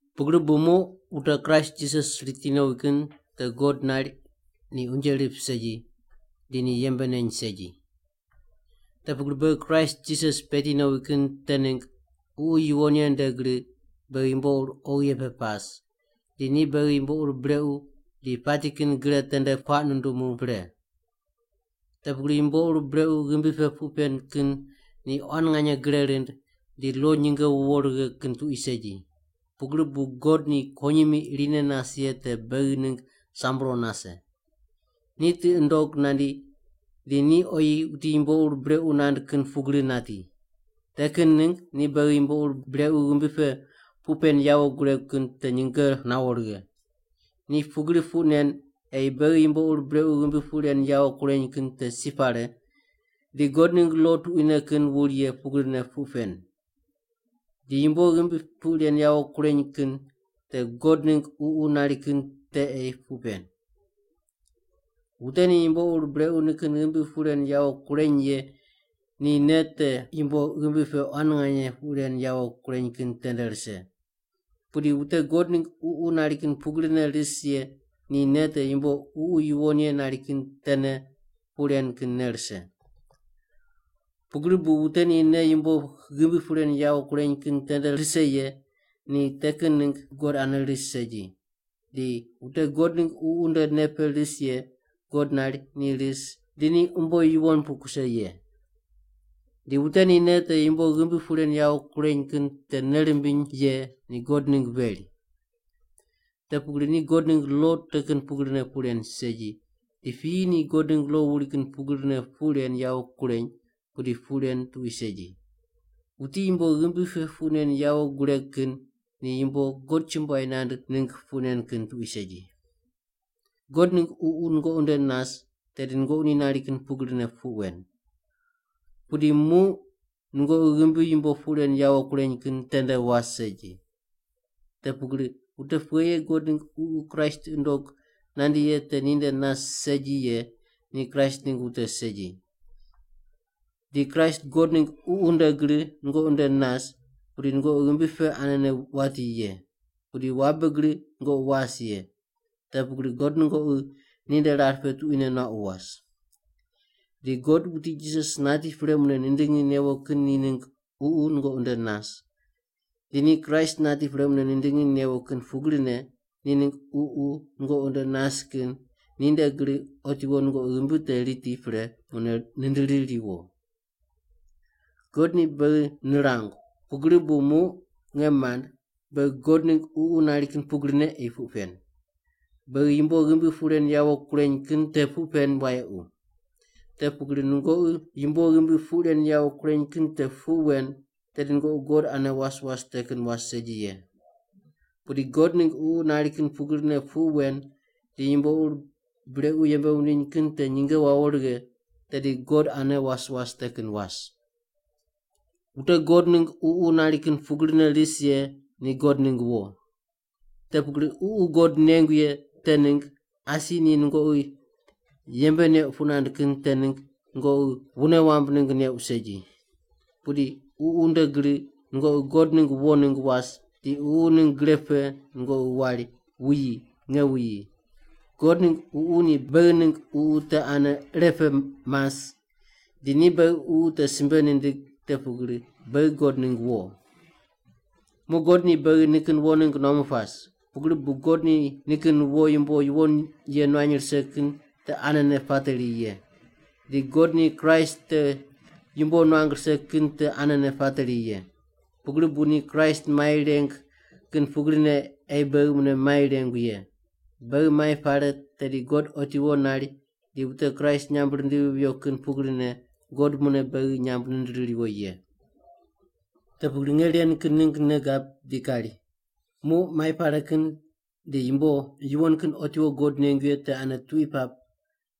Pugri bu muq wute Kraist Jisas riti nowi kin te God nari ni unje rip segi, di ni yembe neny segi. Te pugri beghi Kraist Jisas peti nowi kin te ningg Ququ Yuwon Ye nde gri beghi yumbo ur oghi ye pe pas, di ni beghi yumbo ur brequ di pati kin gre tende puaq nundumu pre. Te pugri yumbo ur brequ ghimbi pe puq pen kin ni quan nganye gre rind, di lo nyinge wuwo righe kin tuqui segi. Pugri bu God ni kuwonyimi irine nas ye te beghi ningg sambro nase. Ni tiqi nundog nandi di ni oyi wuti yumbo ur brequ nand kin pugri nati. Te kin ningg ni beghi yumbo ur brequ ghimbi pe puq pen yawo guregu kin te nyinge nawo righe. Ni pugri puq nen ei beghi yumbo ur brequ ghimbi puq ren yawo kureny kin te si pare di God ningg lo tuquine kin wuri ye pugrine puq pen. Di yumbo ghimbi puq ren yawo kureny kin te God ningg Ququ nari kin te ei puq pen. Wute ni yumbo ur brequ nikin ghimbi puq ren yawo kureny ye, ni nei te yumbo ghimbi pe quan nganye puq ren yawo kureny kin tende rise. Pudi wute God ningg Ququ nari kin pugrine ris ye ni nei te yumbo Ququ Yuwon Ye nari kin tene puq ren kin nei rise. Pugri bu wute ni nei yumbo ghimbi puq ren yawo kureny kin tende rise ye ni te kin ningg God ane ris segi; di wute God ningg Ququ nde nei pe ris ye, God nari ni ris di ni umbo yuwon pu kuse ye. Di wute ni nei te yumbo ghimbi puq ren yawo kureny kin te nei rimbiny ye ni God ningg veri. Te pugri ni God ningg lo te kin pugrine puq ren segi, di piyi ni God ningg lo wuri kin pugrine puq ren yawo kureny pudi puq ren tuqui segi. Wuti yumbo ghimbi pe puq nen yawo gureg kin ni yumbo God chumbuai nand ningg puq nen kin tuqui segi. God ningg Ququ nungoqi nde nas tedi nungoqi ni nari kin pugrine puq wen. Pudi muq nungoqi ghimbi yumbo puq ren yawo kureny kin tende was segi. Te pugri wute pughe ye God ningg Ququ Kraist tiqi nundog nandi ye te ni nde nas segi ye ni Kraist ningg wute segi. Di Kraist God ningg Ququ nde gri nungoqi nde nas, pudi nungoqi ghimbi pe anene wati ye. Pudi wabe gri nungoqi was ye, te pugri God nungoqi ni nde rar pe tuquine nuaqu was. Di God wuti Jisas nati pre mune nindingi newo kin ni ningg Ququ nungoqi nde nas, di ni Kraist nati pre mune nindingi newo kin pugrine ni ningg Ququ nungoqi nde nas kin ni nde gri otiwo nungoqi ghimbi te riti pre mune nindiri riwo. God ni beghi nirangu, pugri bu muq nge mand, beghi God ningg Ququ nari kin pugrine ei puq pen. Beghi yumbo ghimbi puq ren yawo kureny kin te puq pen wayequ. Te pugri nungoqi yumbo ghimbi puq ren yawo kureny kin te puq wen tedi nungoqi God ane was was te kin was segi ye. Pudi God ningg Ququ nari kin pugrine puq wen di yumbo ur brequ yembe wundiny kin te nyinge wawo righe, tedi God ane was was te kin was. Wute God ningg Ququ nari kin pugrine ris ye ni God ningg wo. Te pugri Ququ God neuq ye te ningg asi ni nungoqi yembe neuq puq nand kin te ningg nungoqi wune wamb ningg neuq segi. Pudi Ququ nde gri nungoqi God ningg wo ningg was di Ququ ningg gre pe nungoqi wari, “Wuyi! Nge wuyi!” God ningg Ququ ni beghi ningg ququ te ane irepe mas di ni beghi ququ te simbe nindig te pugri beghi God ningg wo. Muq God ni beghi nikin wo ningg nuamu pas, pugri bu God ni nikin wo yumbo yuwon ye nuany rise kin te anene pateri ye. Di God ni Kraist te yumbo nuang rise kin te anene pateri ye. Pugri bu ni Kraist mai reng kin pugrine ei beghi mune mai rengu ye. Beghi mai pare tedi God otiwo nari di wute Kraist nyamb rindivi viyo kin pugrine God mune beghi nyamb nindiri riwo ye. Te pugri nge ren kin ningg nei gab di kari, muq mai pare kin di yumbo yuwon kin otiwo God nengu ye te ane tuqui pap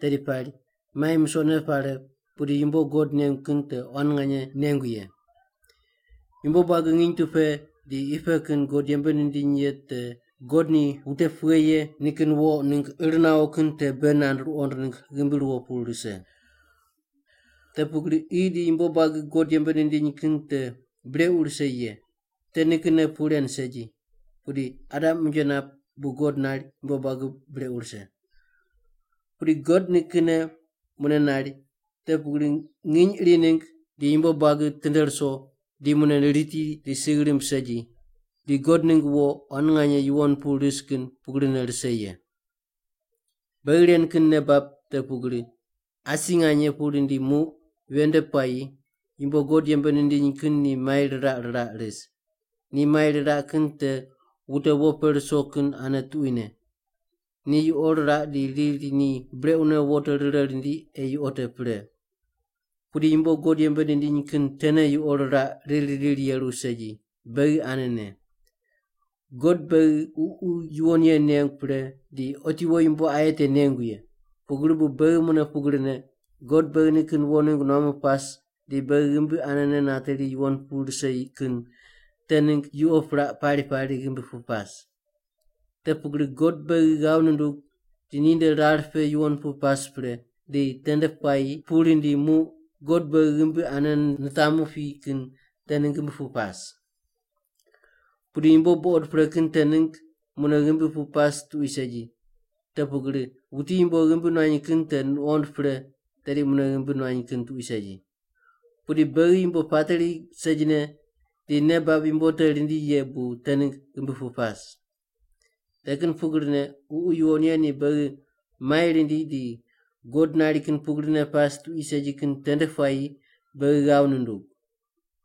tedi pari mai musoqne pare pudi yumbo God nengu kin te quan nganye nengu ye. Yumbo buagi nginy tu pe di qi pe kin God yembe nindiny ye te God ni wute pughe ye nikin wo ningg ir nawo kin te bei nand ruqond ningg ghimbi ruwo pu rise. Te pugri qi di yumbo buagi God yembe nindiny kin te brequ rise ye, te nikinne puq ren segi, pudi Adam unje nap bu God nari yumbo buagi brequ rise. Pudi God nikinne mune nari, te pugri nginy iri ningg di yumbo buagi tinde ruso di mune riti di sigh rimb segi di God ningg wo quan nganye yuwon pu ris kin pugrine rise ye. Beghi ren kin nei bab te pugri, asi nganye pu rindi muq ven nde puayi yumbo God yembe nindiny kin ni mai riraq riraq ris. Ni mai riraq kin te wute wo pe ruso kin ane tuquine. Ni yuqo riraq di riri ni brequne wo te rire rindi ei yuqo te pre. Pudi yumbo God yembe nindiny kin tene yuqo riraq riri riri yeru segi, beghi anene. God beghi Ququ Yuwon Ye nengu pre di otiwo yumbo aye te nengu ye. Pugri bu beghi mune pugrine, God beghi nikin wo ningg nuamu pas di beghi ghimbi anene nateri yuwon pu rise kin te ningg yuqo piraq pari pari ghimbi pu pas. Te pugri God beghi ghav nundug di ni nde rar pe yuwon pu pas pre, di tende puayi pu rindi muq God beghi ghimbi ane nitamu pi kin te ningg ghimbi pu pas. Pudi yumbo buqod pre kin te ningg mune ghimbi pu pas tuqui segi, te pugri wuti yumbo ghimbi nuany kin te nuqond pre tedi mune ghimbi nuany kin tuqui segi. Pudi beghi yumbo pateri segine di nei bab yumbo te rindi ye bu te ningg ghimbi pu pas. Te kin pugrine Ququ Yuwon Ye ni beghi mai rindi di God nari kin pugrine pas tuqui segi kin tende puayi beghi ghav nundug.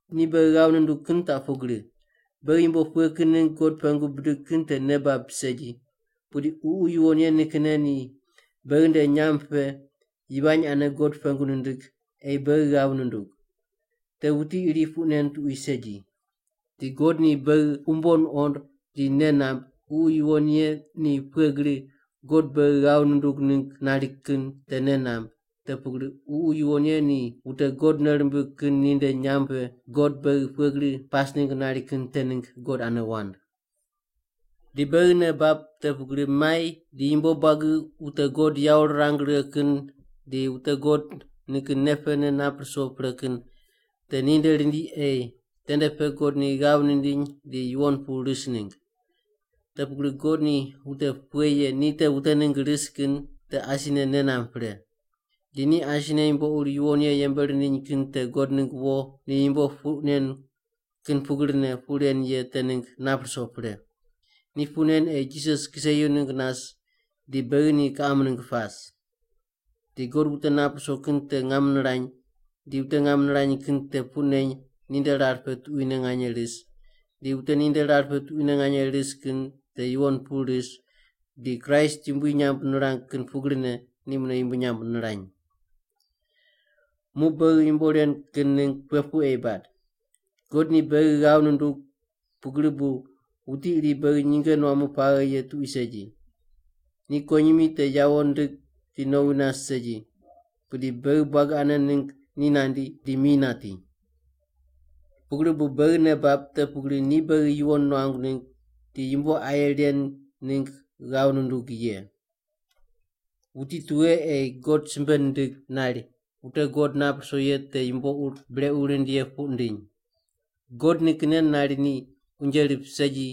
Ni beghi ghav nundug kin te pugri: Beghi yumbo pughe kin ningg God pengu bidig kin te nei bab segi, pudi Ququ Yuwon Ye nikinne ni beghi nde nyamb pe yivany ane God pengu nindig ei beghi ghav nundug. Te wuti iri puq nen tuqui segi. Di God, ni beghi umbo nuqond di nei namb, Ququ Yuwon Ye ni pughe gri God beghi ghav nundug ningg nari kin te nei namb, te pugri Ququ Yuwon Ye ni wute God nei rimbig kin ni nde nyamb pe God beghi pughe gri pas ningg nari kin te ningg God ane wand. Di beghi nei bab te pugri mai di yumbo buagi wute God yawo rirang righe kin di wute God nikin nei pene nap ruso pre kin te ninde rindi ei tende pe God ni ghav nindiny di yuwon pu ris ningg. Te pugri God ni wute pughe ye ni te wute ningg ris kin te asine nei namb pre. Di ni asine yumbo ur yuwon ye yembe rindiny kin te God ningg wo ni yumbo puq nen kin pugrine puq ren ye te ningg nap ruso pre. Ni puq nen ei Jisas kiseyu ningg nas di beghi ni kiqam ningg pas. Di God wute nap ruso kin te ngam nirany, di wute ngam nirany kin te puq neny ninde rar pe tuquine nganye ris, di wute ninde rar pe tuquine nganye ris kin te yuwon pu ris di Kraist yumbui nyamb nirang kin pugrine ni mune yumbui nyamb nirany. Muq beghi yumbo ren kin ningg pughe puq ei bad? God ni beghi ghav nundug, pugri bu wuti iri beghi nyinge nuamu paghe ye tuqui segi. Ni kuwonyimi te yawo ndig di nowi nas segi pudi beghi buagi ane ningg ni nandi di mi nati. Pugri bu beghi nei bab te pugri ni beghi yuwon nuangu ningg di yumbo aye ren ningg ghav nundug ye. Wuti tughe ei God simbe nindig nari wute God nap ruso ye te yumbo ur brequ rind ye puq nindiny? God nikinne nari ni unje rip segi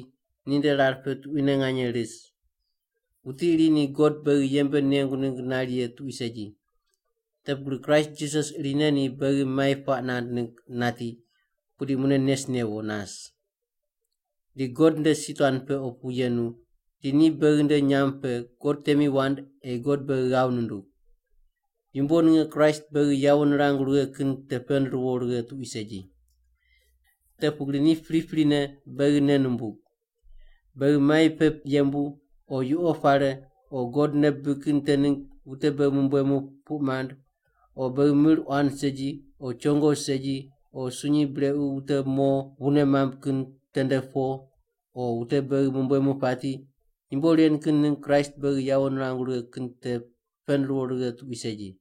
ninde rar pe tuquine nganye ris. Wuti iri ni God beghi yembe nengu ningg nari ye tuqui segi. Te pugri Kraist Jisas irine ni beghi mai puaq nand ningg nati, pudi mune nes newo nas. Di God nde si tuan pe opu yenu, di ni beghi nde nyamb pe God temi wand ei God beghi ghav nindug. Yumbo ninge Kraist beghi yawo nirangu righe kin te pend ruwo righe tuqui segi. Te pugri ni priprine beghi nei numbug. Beghi mai pe yembu, o yuqo pare, o God nei bibig kin te ningg wute beghi mumbuemu puq mand, o beghi mir quan segi, o chongo segi, o sunyi brequ wute mo wune mamb kin tende po, o wute beghi mumbuemu pati. Yumbo ren kin ningg Kraist beghi yawo nirangu righe kin te pend ruwo righe tuqui segi.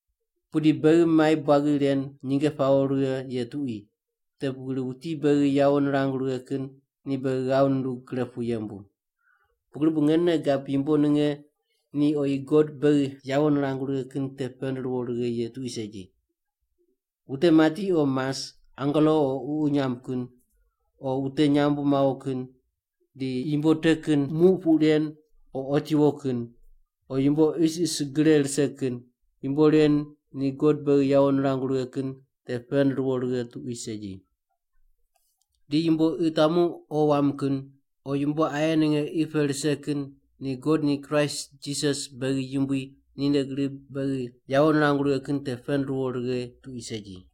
Pudi beghi mai buagi ren nyinge pawo righe ye tuqui, te pugri wuti beghi yawo nirangu righe kin ni beghi ghav nundug gre pu yembu! Pugri bu nge nei gab yumbo ninge ni oyi God beghi yawo nirangu righe kin te pend ruwo righe ye tuqui segi. Wute mati o mas; angelo o ququ nyamb kin, o wute nyambu mawo kin, di yumbo te kin muq puq ren o otiwo kin, o yumbo isis gre rise kin, yumbo ren ni God beghi yawo nirangu righe kin te pend ruwo righe tuqui segi. Di yumbo qi tamu o wam kin; o yumbo aye ninge qi pe rise kin ni God ni Kraist Jisas beghi Yumbui ninde gri beghi yawo nirangu righe kin te pend ruwo righe tuqui segi.